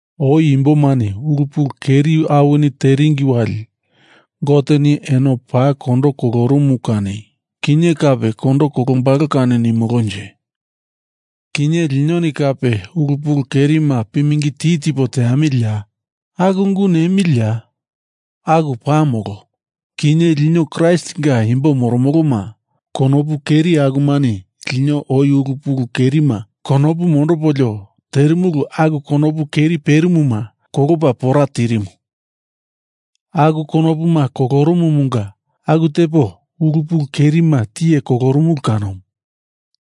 Oi imbomani ulu pulu keri awini teringi wali Goteni eno paa kondo kolorumumu kani, kinye kape kondo kolombalo kani nimolonje? Kinye linoni kape ulu pulu kerima pimingi ti tipo teamiliya? Aku ungu nemiliya? Aku paa molo. Kinye lino Kraistinga imbo moromoloma konopu keri akumani lino oi ulu pulu kerima konopu mondopolio terimulu aku konopu keri perimuma kolopa pora tirimu. Aku konopuma kolorumumunga aku tepo ulu pulu kerima tiye kolorumulu kanomu.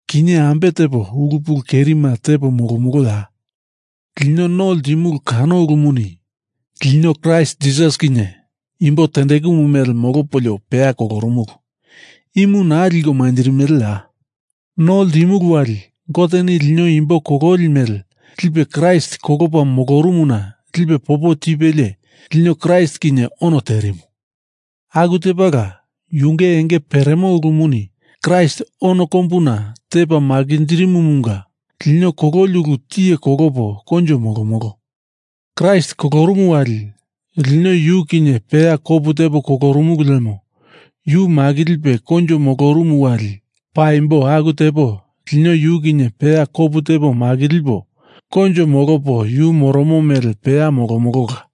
Kinye ambe tepo ulu pulu kerima tepo molomoloya? Lino no ltimulu kano ulumuni lino Kraist Jisas kinye imbo tendekumu mele molopolio peya kolorumulu. Imu naa liko manjirimeleya? No ltimulu wali Goteni lino imbo kololi mele lipe Kraist kolopa molorumuna lipe popo tipelie lino Kraist kinye ono terimu. Aku tepala yunge enge peremo ulumuni Kraist ono kombuna tepa makinjirimumunga lino kololi ulu tiye kolopo koinjo molomolo. Kraist kolorumu wali, lino yu kinye peya kopu tepo kolorumulu lemo yu makilipe koinjo molorumu wali paimbo aku tepo lino yu kinye peya kopu tepo makilipo koinjo molopo yu moromo mele peya molomolola.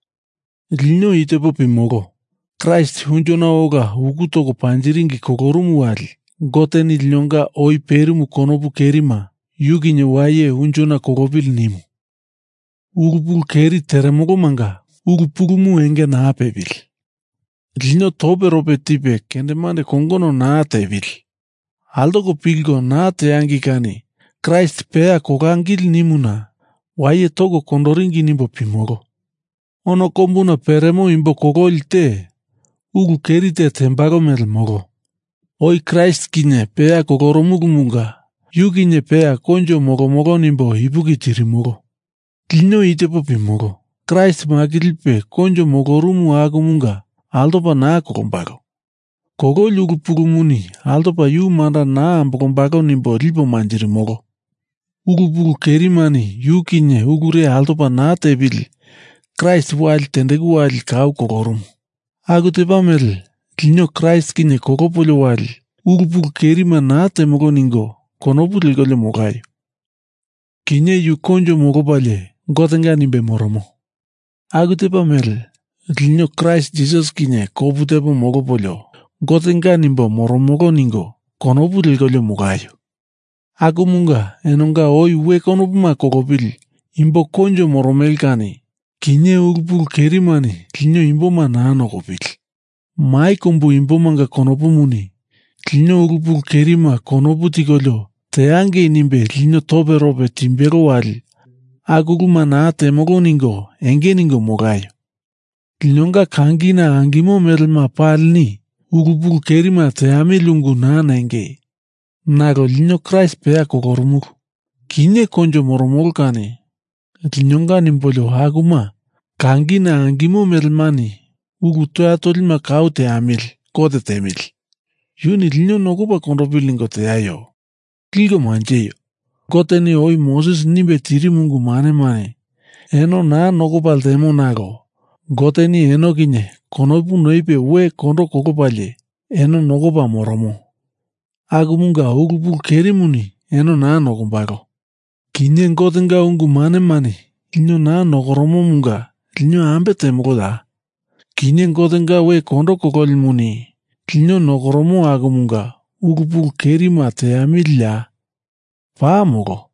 Lino i tepo pimolo. Kraist unjona ola uku toko panjiringi kolorumu wali Goteni linonga oi perimu konopu kerima Yu kinye waye unjona kolopili nimu. Ulu pulu keri teremolomanga ulu pulumu enge naa pepili, lino toperope tipe kendemande kongono naa tepili, altoko pilko naa teangei kani Kraist peya kolangili nimuna waye toko kondoringi nimbo pimolo. Ono kombuna peremo imbo kololi te, ulu keri te tembalo mele molo. Oi Kraist kinye peya kolorumulumunga yu kinye peya koinjo molomolo nimbo ipuki tirimolo. Lino i tepo pimolo. Kraist makilipe koinjo molorumu akumunga altopa naa kolombalo. Kololi ulu pulumuni altopa yu manda naa ambolombalo nimbo lipo manjirimolo. Ulu pulu kerimani yu kinye ulure altopa naa tepili Kraist wali tendeku wali kau kolorumu. Aku tepa mele lino Kraist kinye kolopolio wali ulu pulu kerima naa temolo ningo konopu lekolio molaio. Kinye yu koinjo molopalie Gotenga nimbe moromo. Aku tepa mele lino Kraist Jisas kinye kopu tepo molopolio Gotenga nimbo moromolo ningo konopu lekolio molaio. Akumunga enonga oi we konopuma kolopili imbo koinjo moromele kani kinye ulu pulu kerimani lino imboma naa nokopili, mai kombu imbomanga konopumuni lino ulu pulu kerima konopu tikolio teangei nimbe lino toperope timbelo wali aku uluma naa temolo ningo enge ningo molaio. Linonga kangina angimo melema palini ulu pulu kerima teamili ungu naa nengei. Nalo Lino Kraist peya kolorumulu, kinye koinjo moromolo kani linonga nimbolio akuma kangina angimo melemani ulu toya tolima kau teamili Gote tiemili. Yuni lino nokopa kondopili ningo teaio. Liko manjeio! Goteni oi Moses nimbe tirimu ungu manemani eno naa nokopa ltemo nalo Goteni eno kinye konopu noipe we kondo kolopalie eno nokopa moromo. Akumunga ulu pulu kerimuni eno naa nokombalo. Kinye Gotenga ungu manemani lino naa nokoromomunga lino ambe temoloya? Kinye Gotenga we kondo kololimuni lino nokoromo akumunga ulu pulu kerima teamiliya? Paa molo!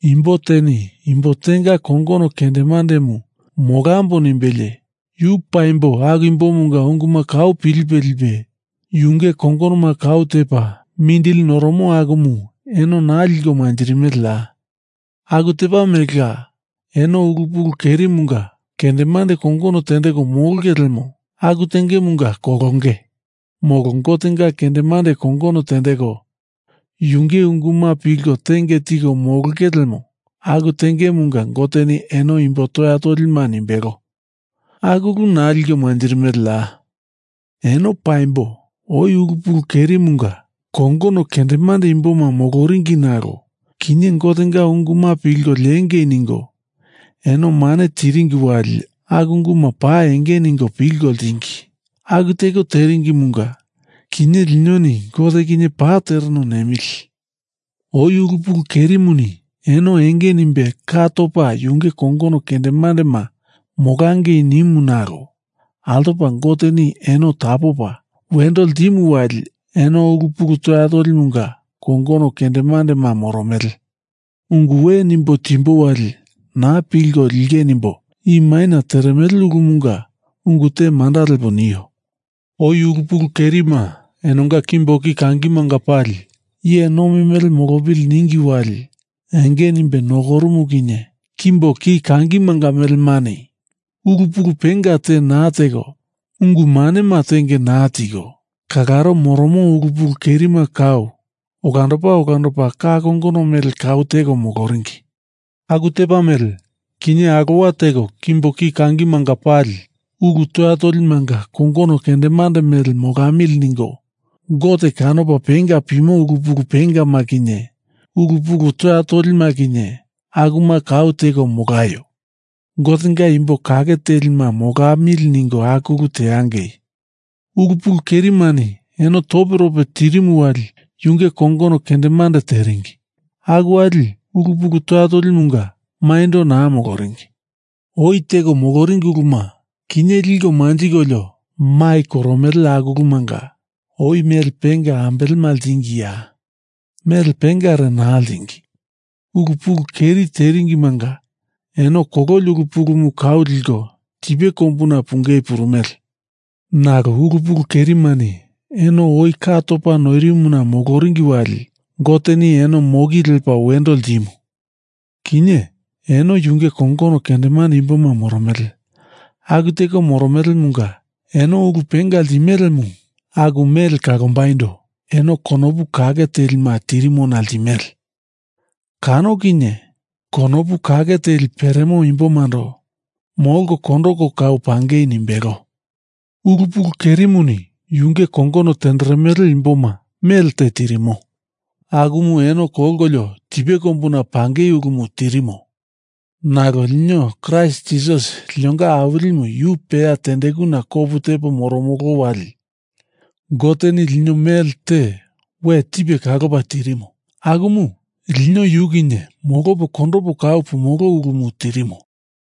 Imbo teni imbo tenga kongono kendemandemu molambo nimbelie yu paimbo aku imbomunga unguma kau pilipe lipe yunge kongonoma kau tepa mindili noromo akumu eno naa liko manjirimeleya? Aku tepa melela eno ulu pulu kerimunga kendemande kongono tendeko molonge lemo aku tengemunga kolonge. Molo Gotenga kendemande kongono tendeko yunge unguma pilko tenge tiko molonge lemo aku tengemunga Goteni eno imbo toya tolima nimbelo. Aku ulu naa liko manjirimeleya? Eno paimbo oi ulu pulu kerimunga kongono kendemande imboma moloringi nalo kinye Gotenga unguma pilko liengei ningo eno mane tiringi wali aku unguma paa enge ningo pilko ltingi, aku teko teringimunga kinye linoni Gote kinye Paa tereno nemili. Oi ulu pulu kerimuni eno enge nimbe ka topa yunge kongono kendemandema molangei nimu nalo altopa Goteni eno tapopa wendo ltimu wali eno ulu pulu toya tolimunga kongono kendemandema moromele. Ungu we nimbo timbo wali na pilko linge nimbo i maina teremele ulumunga ungu te manda lepo nio. Oi ulu pulu kerima enonga kimbo ki kangimanga pali iye nomi mele molopili ningi wali enge nimbe nokorumu kinye kimbo ki kangimanga melemani ulu pulu penga te naa teko, ungu manema tenge naa tiko kalaro moromo ulu pulu kerima kau olandopa olandopa ka kongono mele kau teko moloringi, aku tepa mele kinye alowa teko kimbo ki kangimanga pali ulu toya tolimanga kongono kendemande mele molamili ningo Gote kanopa penga pimo ulu pulu pengama kinye ulu pulu toya tolima kinye akuma kau teko molaio. Gotenga imbo kake telima molamili ningo aku ulu teangei. Ulu pulu kerimani eno toperope tirimu wali yunge kongono kendemande tenderingi. Aku wali ulu pulu toya tolimunga maindo naa moloringi. Oi teko moloringi uluma kinye liko manjikolio mai koromele aku ulumanga oi mele penga ambelema ltingiya? Mele pengare naa ltingi. Ulu pulu keri teringimanga eno kololi ulu pulumu kau liko tipe kombuna pungei purumele. Nalo ulu pulu kerimani eno oi ka topa noirimona moloringi wali Goteni eno moki lepa wendo ltimu. Kinye eno yunge kongono kendemande imboma moromele. Aku teko moromelemunga eno ulu penga ltimelemu aku mele kalombaindo eno konopu kake telima tirimona ltimele. Kano kinye konopu kake teli peremo imbomando molko kondoko kau pangei nimbelo. Ulu pulu kerimuni yunge kongono tenderemele imboma mele te tirimo. Akumu eno kolkolio tipe kombuna pangei ulumu tirimo. Nalo lino Kraist Jisas linonga Awilimu yu peya tendekuna kopu tepo moromolo wali Goteni lino mele te we tipe kalopa tirimo, akumu lino yu kinye molopo kondopo kau pumolo ulumu tirimo.